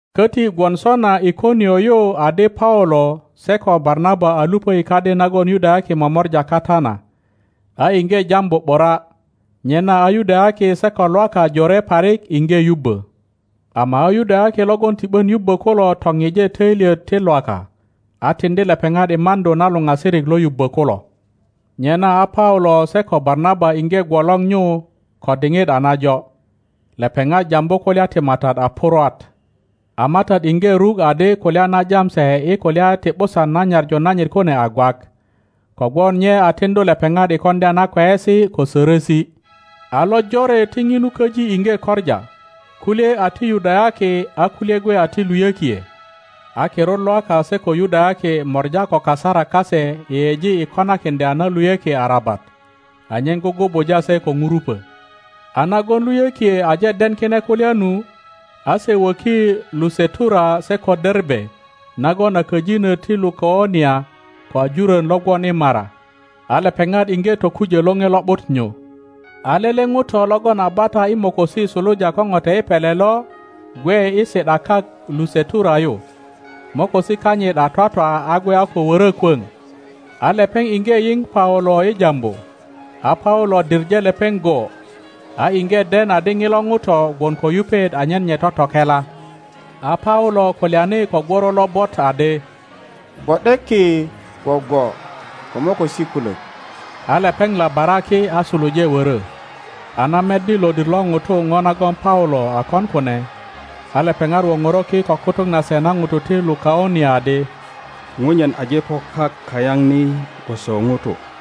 Köti gwon sona Ikonio yu adi Paulo se ko Barnaba a luŋdi kadi nagon Yudayaki momora kata na, a iŋge jambu ’bura, nyena a Yudayaki se ko Lwaka jore parik iŋge yubbö. Ama a Yudayaki logon ti ’bön yubbö kulo toŋŋe töilyet ti Lwaka, a tiŋdi lepeŋat i maŋdu na luŋasirik lo yubbö kulo. Nyena a Paulo se ko Barnaba iŋge gwolor nyu ko diŋit a najo. Lepeŋat jambu kulya ti Matat a purwat; a Matat iŋge ruk adi kulya na jam se i kulya ti ’busan na nyaŋu nanyit kune a gwak, kogwon nye a tiŋdu lepeŋat i koŋdya na kweyesi ko sörösi. A lojore ti ŋinu köji iŋge koŋa, kulye a ti Yudayaki a kulye gwe a ti luyökie. a kirut Lwaka se ko Yudayaki mora ko kasarak kase yeyeji i konakiŋdya na luyökie arabat, anyen gugubuja se ko ŋurupö. a nagon luyökie aje den kine kulya nu, a se wöki Lusetura se ko Derbe nagon a köjinö ti Lukaŋ nia ko i jurön lo gwon i mara, a lepeŋat iŋge tokujö Loŋe Lo ’but nyu. A lele ŋuto logon a bata i mokosi suluja ko ŋote i pele lo gwe i si ’da kak Lusetura yu, mokosi kanyit a twatwa a gwe a ko wörö kwöŋ. A lepeŋ iŋge yiŋ Paulo i jambu, a Paulo diŋe lepeŋ go, a iŋge den adi ŋilo ŋuto gwon ko yupet anyen nye totokela, a Paulo kulyani ko gworo lobot adi, Gwo ’de ki gwogwo ko mokosi kulök! A lepeŋ labara ki a suluje wörö. A na meddi lodir lo ŋutu ŋo nagon Paulo a kon kune, a lepeŋat woŋoro ki ko kutuk nase na ŋutu ti Lukaŋ nia adi, Ŋunyen aje po kak kayaŋ ni gwoso ŋutu.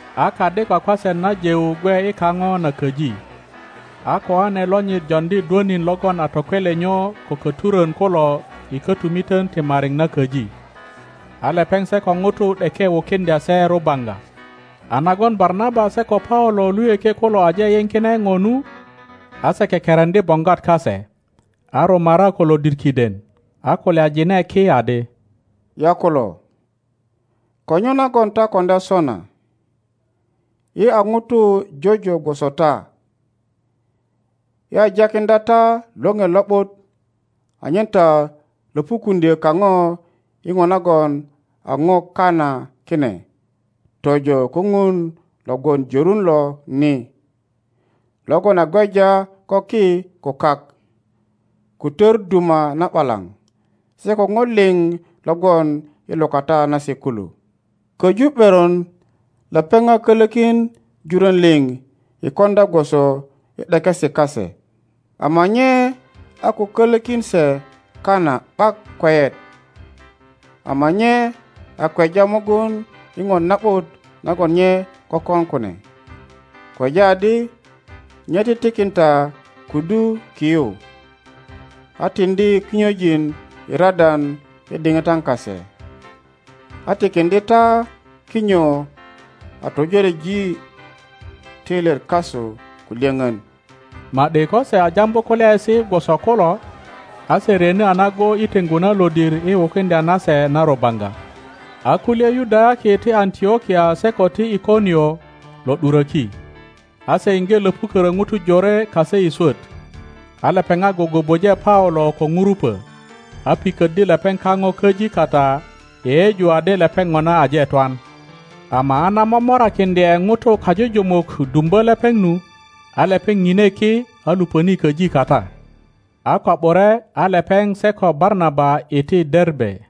a kadi kwakwaset na Jeu gwe i kaŋo na köji, a koane lonyit joŋdi dwönin logon a tokwelenyo ko köturön kulo i kötumitön ti mariŋ na köji. A lepeŋ se ko ŋutu ’deke wukiŋdya se rubaŋga. A nagon Barnaba se ko Paulo luyökie kulo aje yiŋ kine ŋo nu, a se kekereŋdi boŋgwat kase, a rumara ko lodir kiden, a kulyajine ki adi, Yakulo, ko nyo nagon ta koŋdya sona? Yi a ŋutu jojo gwoso ta, yi a jakiŋdya ta Loŋe Lo ’but anyen ta löpukuŋdyö kaŋo i ŋo nagon a ŋo kana kine tojo ko Ŋun lo gwon jörun lo ni, logon a gweja ko ki ko kak, ko tör duma na ’balaŋ se ko ŋo liŋ lo gwon i lukata nase kulo. Köju ’beron lepeŋ a kölökin jurön liŋ i koŋdya gwoso i ’dekesi kase, ama nye a ko kölökin se kana ’bak kweyet, ama nye a kweja mugun i ŋo na ’but nagon nye kökon kune, kweja adi nye titikin ta kudu ki yu, a tiŋdi kinyojin i radan i diŋitan kase, a tikiŋdye ta kinyo a töjoreji töilyet kasu ko lyöŋön. Ma ’di ko se a jambu kulyaesi gwoso kulo, a se ryeni a nago i teŋgu na lodir i wukiŋdya na se na rubaŋga. A kulye Yudayaki ti Antlokia se ko ti Ikonio lo ’duröki, a se iŋge löpukörö ŋutu jore kase i swöt, a lepeŋat gugubuje Paulo ko ŋurupö, a piköddi lepeŋ kaŋo köji kata yeyeju adi lepeŋ ŋona aje twan. Ama a na momorakiŋdye ŋutu kajujumuk dumbö lepeŋ nu, a lepeŋ ŋine ki a luŋöni köji kata. A ko ’bure a lepeŋ se ko Barnaba iti Derbe.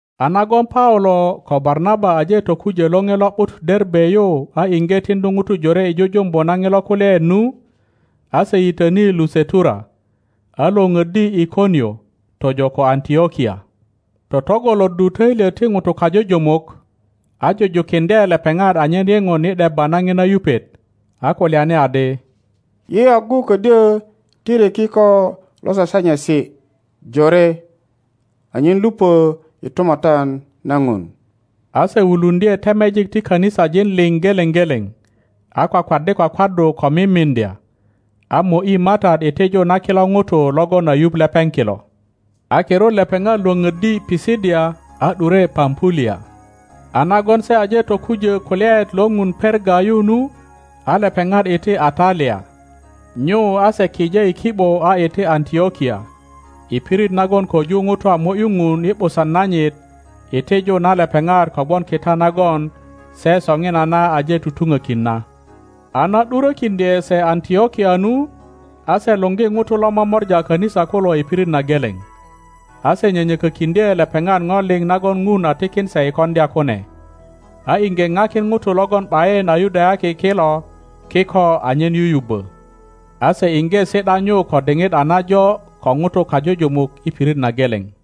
A nagon Paulo ko Barnaba aje tokujö Loŋe Lo ’but Derbe yu a iŋge tiŋdu ŋutu jore i jujumbu na ŋilo kulyaet nu, a se yitöni Lusetura, a lwöŋöddi Ikonio tojo ko Antlokia, totŋgoloddu töilyet ti ŋutu kajujumuk, a jujukiŋdye lepeŋat anyen yeŋon i ’debba na ŋina yupet, a kulyani adi, Yi agu ködyö tiri kiko lo sasanyesi jore anyen luŋö i Tumatyan na Ŋun. A se wuluŋdye temejik ti kanisajin liŋ geleŋ geleŋ, a kwakwaddi kwakwaddu ko mimiŋdya, a mo ’yi Matat i tiju na kilo ŋutu logon a yuŋ lepeŋ kilo. A kirut lepeŋat lwöŋöddi Pisidia a ’dure Pampulia. a nagon se aje tokujö kulyaet lo Ŋun Perga yu nu, a lepeŋat iti Atalia. Nyu a se kije i ki ’bo a iti Antlokia, i pirit nagon köju ŋutu a mo ’yu Ŋun i ’busan nanyit i tiju na lepeŋat kogwon kita nagon se soŋinana aje tutuŋökin na. a na ’durokiŋdye se Antlokia nu, a se luŋgi ŋutu lo momora a kanisa kulo i pirit na geleŋ, a se nyönyökökiŋdye lepeŋat ŋo liŋ nagon Ŋun a tikin se i koŋdya kune, a iŋge ŋakin ŋutu logon ’bayin a Yudayaki kilo kiko anyen yuyubbö. A se iŋge si ’da nyu ko diŋit a najo ko ŋutu kajujumuk i pirit na geleŋ.